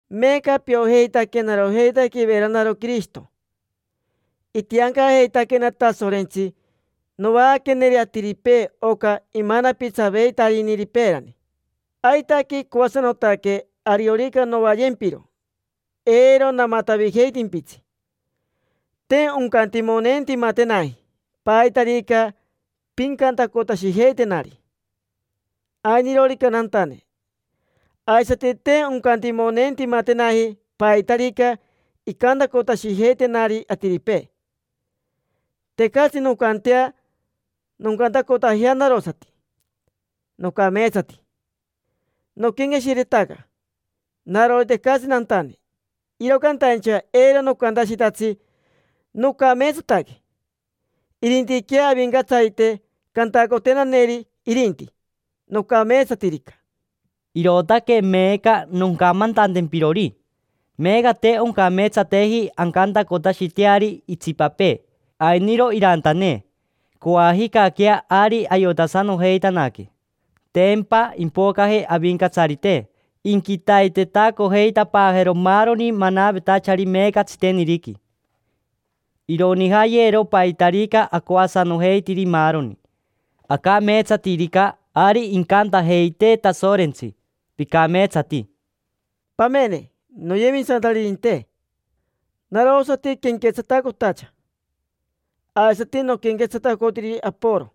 Meeca piojeitaquena narojeitaque iveranaro Quirishito. Itiancajeitaquena Tasorentsi novaaqueneri atiripee oca imanapitsaveitariniri peerani. Aitaque icoasanotaque ariorica novayempiro, eiro namatavijeitimpitsi. Te oncantimoneentimatenaji paitarica pincantacotashijeitenari, ainirorica nantane; aisati te oncantimoneentimatenaji paitarica incantacotashijeitenari atiripee. Tecatsi noncantea noncantacotajea narosati: “Nocameetsati”. Noquenqueshiretaca narori tecatsi nantane, iro cantaincha eiro nocantashitatsi: “Nocameetsataque”. Irintiquea Avincatsarite cantacotenaneri irinti, nocameetsatirica. Irootaque meeca noncamantantempirori: meeca te oncameetsateji ancantacotashiteari itsipapee: “Ainiro irantane”; coajicaquea ari ayotasanojeitanaque. Tempa impocaje Avincatsarite, inquitaitetacojeitapaajero maaroni manavetachari meeca tsiteniriqui. Ironijayero paitarica acoasanojeitiri maaroni. Acameetsatirica, ari incantajeitee Tasorentsi: “Picameetsati”. Pamene, noyemisantaririnte. Narosati quenquetsatacotacha, aisati noquenquetsatacotiri Aporo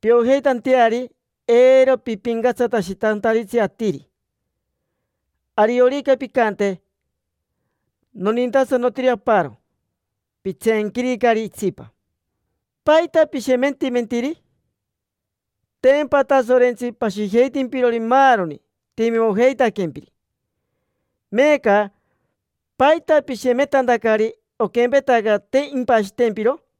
piojeitanteari eiro pipincatsatashitantaritsi atiri. Ariorica pincante: “Nonintasanotiri aparo”, pitseenquiricari itsipa. ¿Paita pishemetimentiri? Tempa Tasorentsi pashijeitimpirori maaroni timimojeitaquempiri. Meeca ¿paita pishemetantacari, oquempetaca te impashitempiro?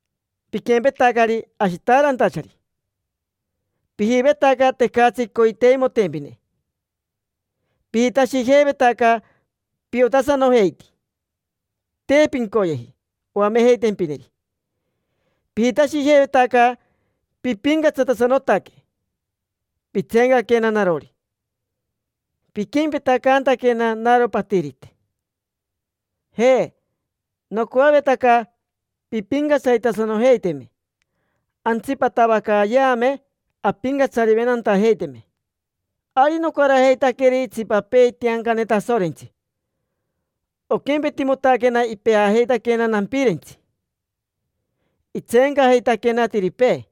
Piquempetacari ashitaarantachari: pijivetaca tecatsi coiteimotempine. Pijitashijeivetaca piotasanojeiti: te pincoyeji oamejeitempineri. Pijitashijeivetaca pipincatsatasanotaque, pitseencaquena narori, piquempetacantaquena naro patirite. Ja, nocoavetaca pimpincatsaritasanojeiteme, antsipatavacayeame ampincatsariventantajeiteme. Ari nocarajeitaqueri itsipapee itiancane Tasorentsi, oquempetimotaquena ipeajeitaquena nampirentsi: itseencajeitaquena atiripee.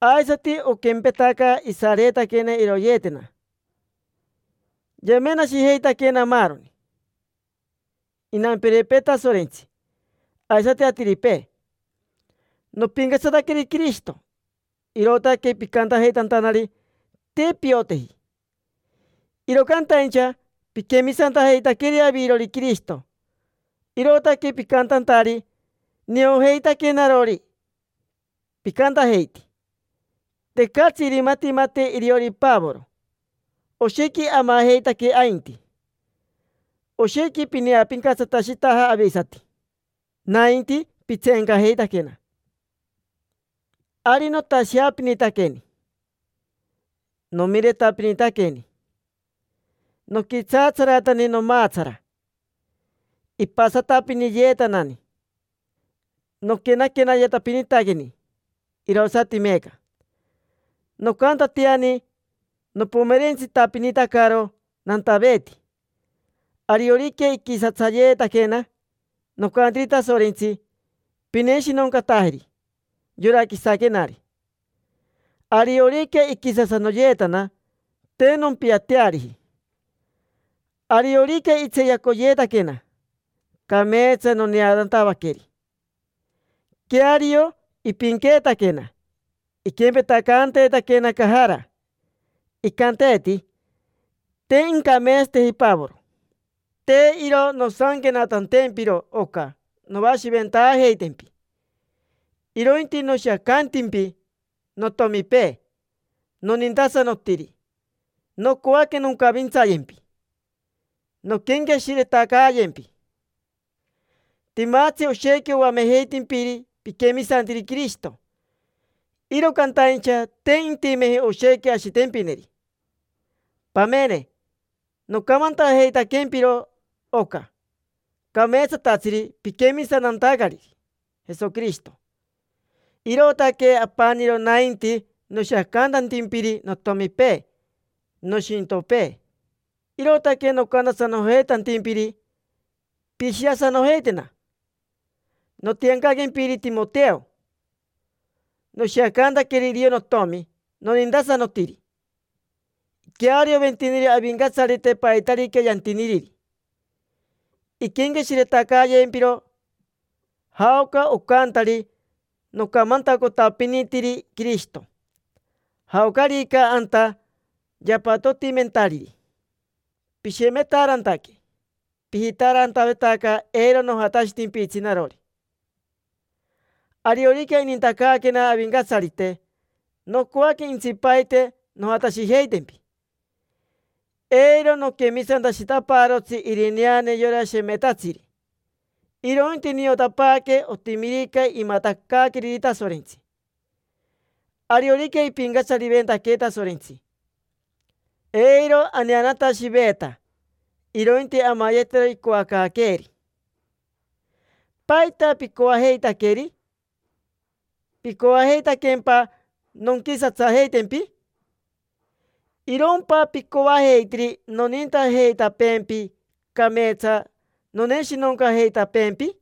Aisati oquempetaca isareetaquena iroyeetena; yamenashejeitaquena maaroni: inampirepee Tasorentsi, aisati atiripee. Nopincatsataqueri Quirishito, irootaque picantajeitantanari: “Te pioteji”. Iro cantaincha piquemisantajeitaqueri avirori Quirishito, irootaque picantantari: “Niojeitaque narori”. Picantajeiti: “Tecatsi irimatimate iriori Pavoro, oshequi amajeitaque ainti”. Oshequi pineapincatsatashitaja avisati, nainti pitseencajeitaquena. Ari notasheapinitaqueni, nomiretapinitaqueni, noquitsaatsaratani nomaatsara, ipasanatapiniyeetanani, noquenaquenatapinitaqueni; irosati meeca. Nocantatiani nopomerentsitapinitacaro nantaveeti. Ariorica iquisatsayeetaquena, nocantiri Tasorentsi: “Pineshinoncatajeri yora quisaquenari”. Ariorica iquisasanoyeetana, te nompiateariji. Ariorica itseeyacoyeetaquena, cameetsa noneanatavaqueri. Queario, ipinqueetaquena, iquempetacanteetaquena cajara, icanteeti: “Te incameetsateji Pavoro”. Te iro nosanquenatantempiro oca novashiventaajeitempi, irointi noshiacantimpi notomipee nonintasanotiri; nocoaque noncavintsayempi, nonquenqueshiretacayempi. Timatsi oshequi oamejeitimpiri piquemisantiri Quirishito, iro cantaincha te intimeji oshequi ashitempineri. Pamene, nocamantajeitaquempiro oca cameetsatatsiri piquemisantantacariri Jesoquirishito, irootaque apaniro nainti noshiacantantimpiri notomipee, nishintopee. Irootaque nocantasanojeitantimpiri: “Pishiasanojeitena”. Notiancaquempiri Timoteo, noshiacantaqueri iriori notomi nonintasanotiri. Iquearioventiniri Avincatsarite paitarica yantiniriri. Inquenqueshiretacayempiro jaoca ocantari nocamantacotapinitiri Quirishito, jaocarica anta yapatotimentariri. Pishemetaarantaque, pijitaarantavetaca eiro nojatashitimpitsi narori. Ariorica inintacaaquena Avincatsarite, nocoaque intsipaite nojatashijeitempi. Eiro noquemisantashitapaarotsi irineane yora shemetatsiri, irointi niotapaaque otimirica imatacaaqueriri Tasorentsi. Ariorica ipincatsariventaquee Tasorentsi, eiro aneanatashiveeta, irointi amayetero icoacaaqueeri. ¿Paita picoajeitaqueri? ¿Picoajeitaquempa nonquisatsajeitapeempi? ¿Irompa picoajeitiri nonintajeitapeempi, cameetsa noneshinoncajeitapeempi?